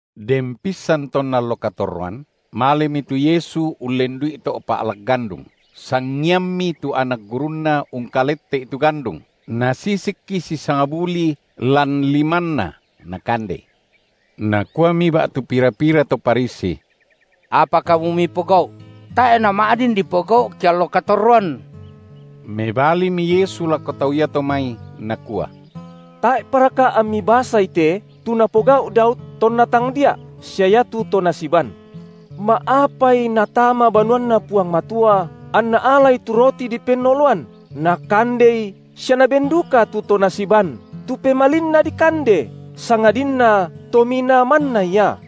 Den pissan tonna allo katorroan, malemi tu Yesu ullendu’i to’ pa’lak gandung, sangiammi tu anak gurunNa ungkalette’i tu gandung, nasisikki sisangbulii lan limanna, nakandei. Nakuami ba’tu pira-pira to Farisi: Apa kamu mipogau’? – tae’ nama’din dipogau’ keallo katorroan! Mebalimi Yesu lako tau iato mai, Nakua: Tae’paraka ammi basai te, tu napogau’ Daud tonna tangdia’ sia iatu to nasiban. Ma’apai natama banuanNa Puang Matua, anna alai tu roti dipennoloan, nakandei sia naben duka tu to nasiban, tu pemalinna dikande, sangadinna to minaa manna ia?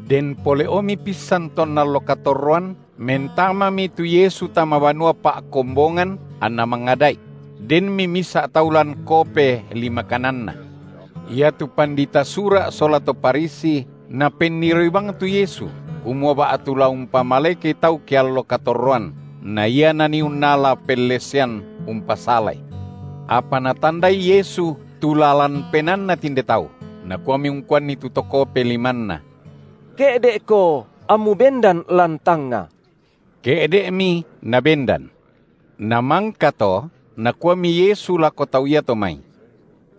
Den pole’omi pissan tonna allo katorroan, mentamami tu Yesu tama banua pa’kombongan, anNa mangada’i; denmi misa’ tau lan kope lima kananna. Iatu pandita Sura’ sola to Farisi napenniroi bang tu Yesu, kumua ba’tu la umpamalekei tau ke allo katorroan, na ia nanii unnala pellesean umpasalai. Apa natandai Yesu tu lalan penaanna tinde tau, Nakuami ungkuanni tu to kope limanna: Ke’de’ko ammu bendan lan tangnga! Ke’de’mi nabendan. Namangka to Nakuami Yesu lako tau iato mai: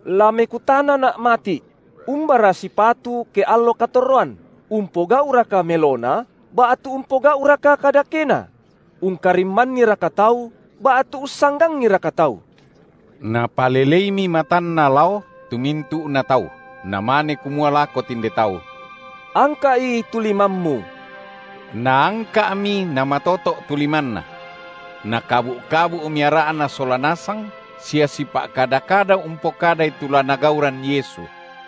La mekutanaNa’ mati’: Umbara sipatu ke allo katorroan, umpogau’raka melona, ba’tu umpogau’raka kadakena; ungkarimmanniraka tau ba’tu ussanggangiraka tau? Napaleleimi matanNa lao tu mintu’na tau, namane kumua lako tinde tau: Angka’i tu limammu! Naangka’mi namatoto’ tu limanna. Nakabu’-kabu’mi ara’na sola nasang sia sipa’kada-kada umpokadai tu la nagauran Yesu.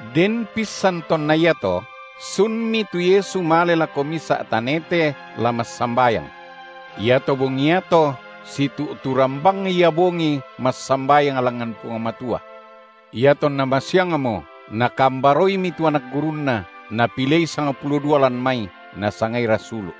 Den pissan tonna iato sunmi tu Yesu male lako misa’ tanete la massambayang. Iato bongi iato, situ’turan bang Ia bongi massambayang langngan Puang Matua. Iatonna masiangmo, Nakambaroimi tu anak gurunNa, Napilei sangpulo dua lan mai, Nasangai rasulu’.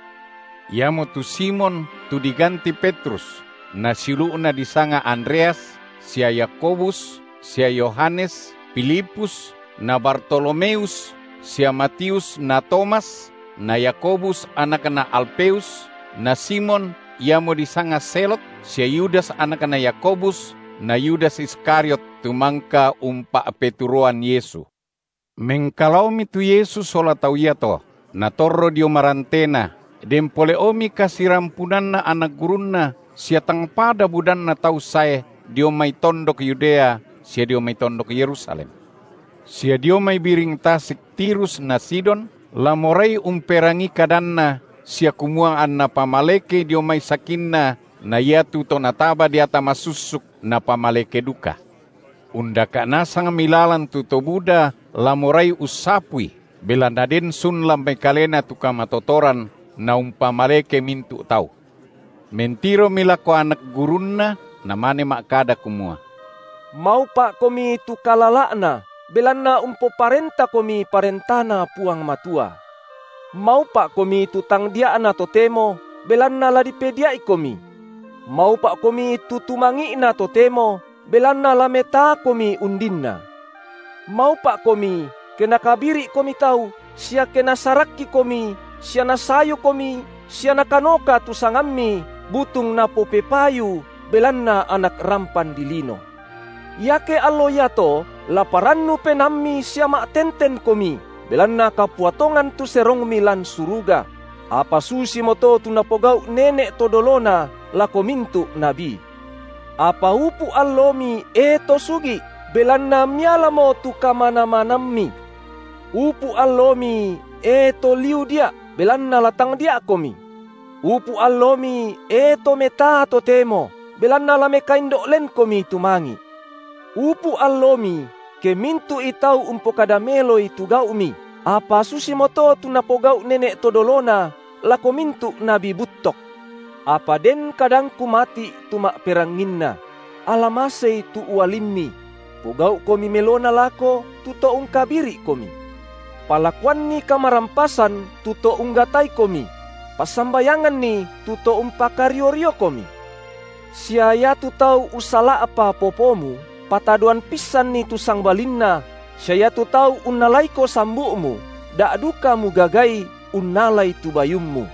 Iamotu Simon, tu diganti Petrus, na siulu’na, disanga Andreas, sia Yakobus, sia Yohanes, Filipus, na Bartolomeus, sia Matius na Tomas, na Yakobus, anakna Alfeus, na Simon, iamo disanga Zelot sia Yudas anakna Yakobus na Yudas Iskariot, tu mangka umpa’peturoan Yesu. Mengkalaomi tu Yesu sola tau iato, natorro dio marantena, den pole’omi kasirampunanna anak gurunNa sia tang pada budanna tau sae dio mai tondok Yudea sia dio mai tondok Yerusalem sia dio mai biring tasik Tirus na Sidon, la morai umperangii kadanNa sia kumua anNa pamalekei dio mai sakinna na iatu to nataba deata masussuk, napamaleke duka; undaka’ nasangmi lalan tu to buda la morai ussapui, belanna den sun lan mai Kalena tu kamatotoran Naumpamaleke mintu’ tau. Mentiromi lako anak gurunNa, Namane ma’kada kumua: Maupa’komi tu kalala’na, belanna umpoparentakomi ParentaNa Puang Matua. Maupa’komi tu tangdia’na totemo, belanna la dipedia’ikomi. Maupa’komi tu tumangi’na totemo, belanna la metaakomi undinna. Maupa’komi, ke nakabiri’komi tau, sia ke nasarakkikomi sia nasayukomi sia nakanoka tu sangammi butung napopepayu belanna Anak rampan dilino. Iake allo iato, laparannu penaammi sia ma’tentenkomi, belanna kapua tongan tu serongmi lan suruga; apa susimoto tu napogau’ nene’ to dolona lako mintu’ nabi. Apa upu’ allomi, e to sugi’, belanna mialamo tu kamanamanammi. Upu’ allomi, e to liu dia’, belanna la tangdia’komi. Upu’ allomi, e to metaa totemo, belanna la mekaindo’ lenkomi tumangi’. Upu’ allomi, ke mintu’i tau umpokada meloi tu gau’mi, apa susimoto tu napogau’ nene’ to dolona lako mintu’ nabi buttok. Apa den kadangKu mati’, tu ma’peranginna: Ala masei tu ualimmi; pogau’komi melona lako to ungkabiri’komi; palakuanni kamarampasan tu to unggataikomi; passambayanganni tu to umpakario-riokomi. Sia iatu tau ussala’pa popomu, patadoan pissanni tu sangbalinna sia iatu tau unnalaiko sambu’mu, da duka mugagai unnalai tu bayummu.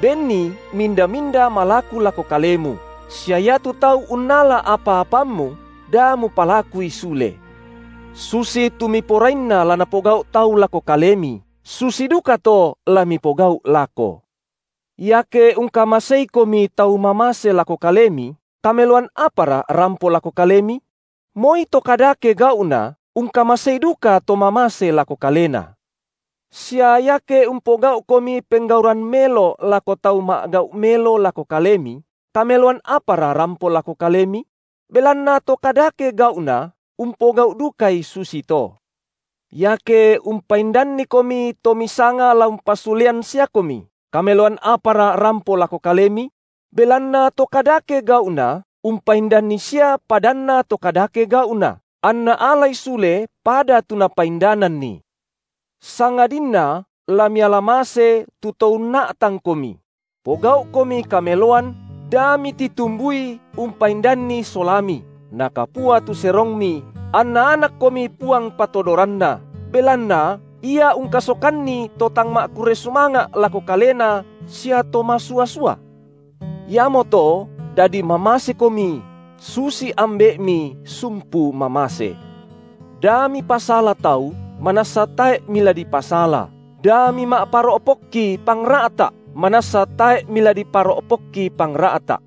Benni minda-minda malaku lako kalemu, sia iatu tau unnala apa-apammu, da mupalakui sule. Susitu miporainna la napogau’ tau lako kalemi, susi dukato la mipogau’ lako. Iake ungkamaseikomi tau mamase lako kalemi, kameloan apara rampo lako kalemi? Moi to kadake gau’na ungkamasei dukato mamase lako kalena. Sia iake umpogau’komi penggauran melo lako tau ma’gau’ melo lako kalemi, kameloan apara rampo lako kalemi? Belanna to kadake gau’na umpogau’ dukai susito. Iake umpaindannikomi to misanga la umpasulean siakomi, kameloan apara rampo lako kalemi? Belanna to kadake gau’na umpaindanni sia padanna to kadake gau’na, anna alai sule pada tu napaindananni. Sangadinna la miala mase tu to unna’tangkomi; pogau’komi kameloan, da mititumbui umpaindanni solami, nakapua tu serongmi, anna anakkomi Puang Patodoranna, belanna, Ia ungkasokanni to tang ma’kurre sumanga’ lako Kalena sia to masua-sua. Iamoto dadi mamasekomi, susi Ambe’mi sumpu mamase. Da mipasala tau, manassa tae’ mila dipasala, da mima’paro’pokki pangra’ta’, manassa tae’ mila diparo’pokki pangra’ta’.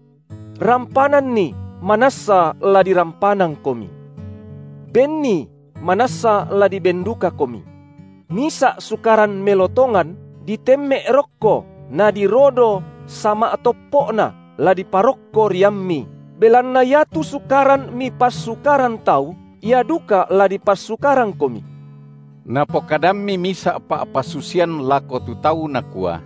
Rampananni, manassa la dirampanangkomi. Benni, manassa la diben dukakomi. Misa’ sukaran melo tongan ditemme’ rokko nadirodo sama’toppo’na, la diparokko riammi, belanna iatu sukaran mipassukaran tau, ia duka la dipassukarangkomi! Napokadammi misa’ pa’pasusian lako tu tau Nakua: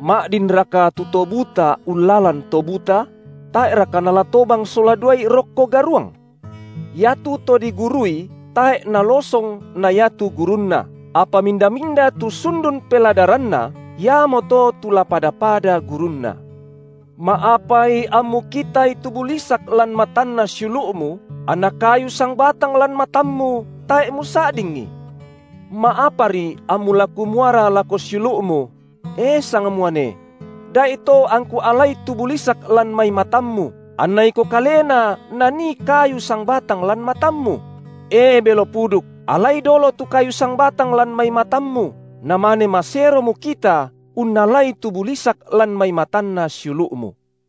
Ma’dinraka tu to buta ullalan to buta? Tae’raka nala tobang sola duai rokko garuang? Iatu to digurui tae’ nalosong na iatu gurunna, apa minda-minda tu sundun peladaranna, iamoto tu la pada-pada gurunna. Ma’apai ammu kitai tu bulisak lan matanna siulu’mu, anna kayu sangbatang lan matammu tae’ musa’dingi? Ma’apari ammu la kumuara lako siulu’mu: E sangmuane! Da’ito angku alai tu bulisak lan mai matammu, anna iko kalena nanii kayu sangbatang lan matammu? E belo puduk, alai dolo tu kayu sangbatang lan mai matammu, namane masero mukita unnalai tu bulisak lan mai matanna siulu’mu.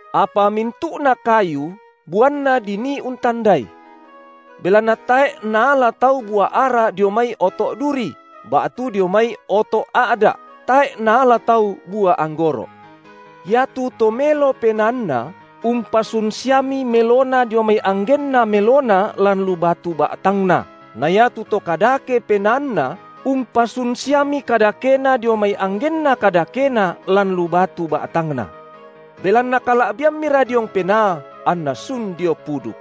Apa mintu’na kayu buanna dinii untandai. Belanna tae’ naala tau bua ara dio mai oto’ duri ba’tu dio mai oto’ a’da’ tae’ naala tau bua anggoro’. Iatu to melo penaanna, umpasun siami melona dio mai anggenna melona lan lu batu ba’tangna, na iatu to kadake penaanna, umpasun siami kadakena dio mai anggenna kadakena lan lu batu ba’tangna. Belanna kala’biammira diong penaa anna sun dio puduk.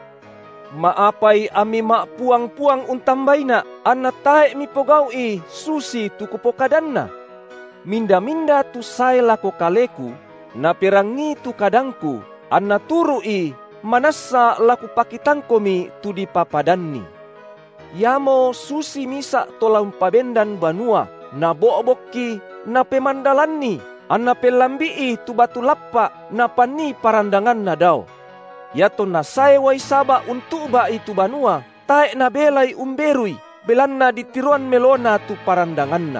Ma’apai ammi ma’puang-puang untambaiNa’, anna tae’ mipogau’i susitu Kupokadanna? Minda-minda tu sae lako Kaleku, naperangii tu kadangKu, anna turu’i manassa la Kupakitangkomi tu dipapadanni. Iamo susi misa’ to la umpabendan banua, nabo’bokki, napemandalanni, anna pellambi’i tu batu lappa’ napannii parandanganna dao. Iatonna sae uai saba’ untu’ba’i tu banua, tae’ nabelai umberui, belanna ditiroan melona tu parandanganna.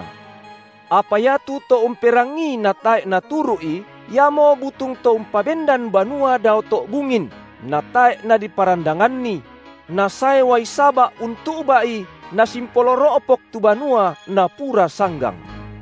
Apa iatu to umperangii natae’ naturu’i, iamo butung to umpabendan banua dao to’ bungin, natae’ nadiparandanganni; nasae uai saba’ untu’ba’i nasimpolo ro’pok tu banua napura sanggang.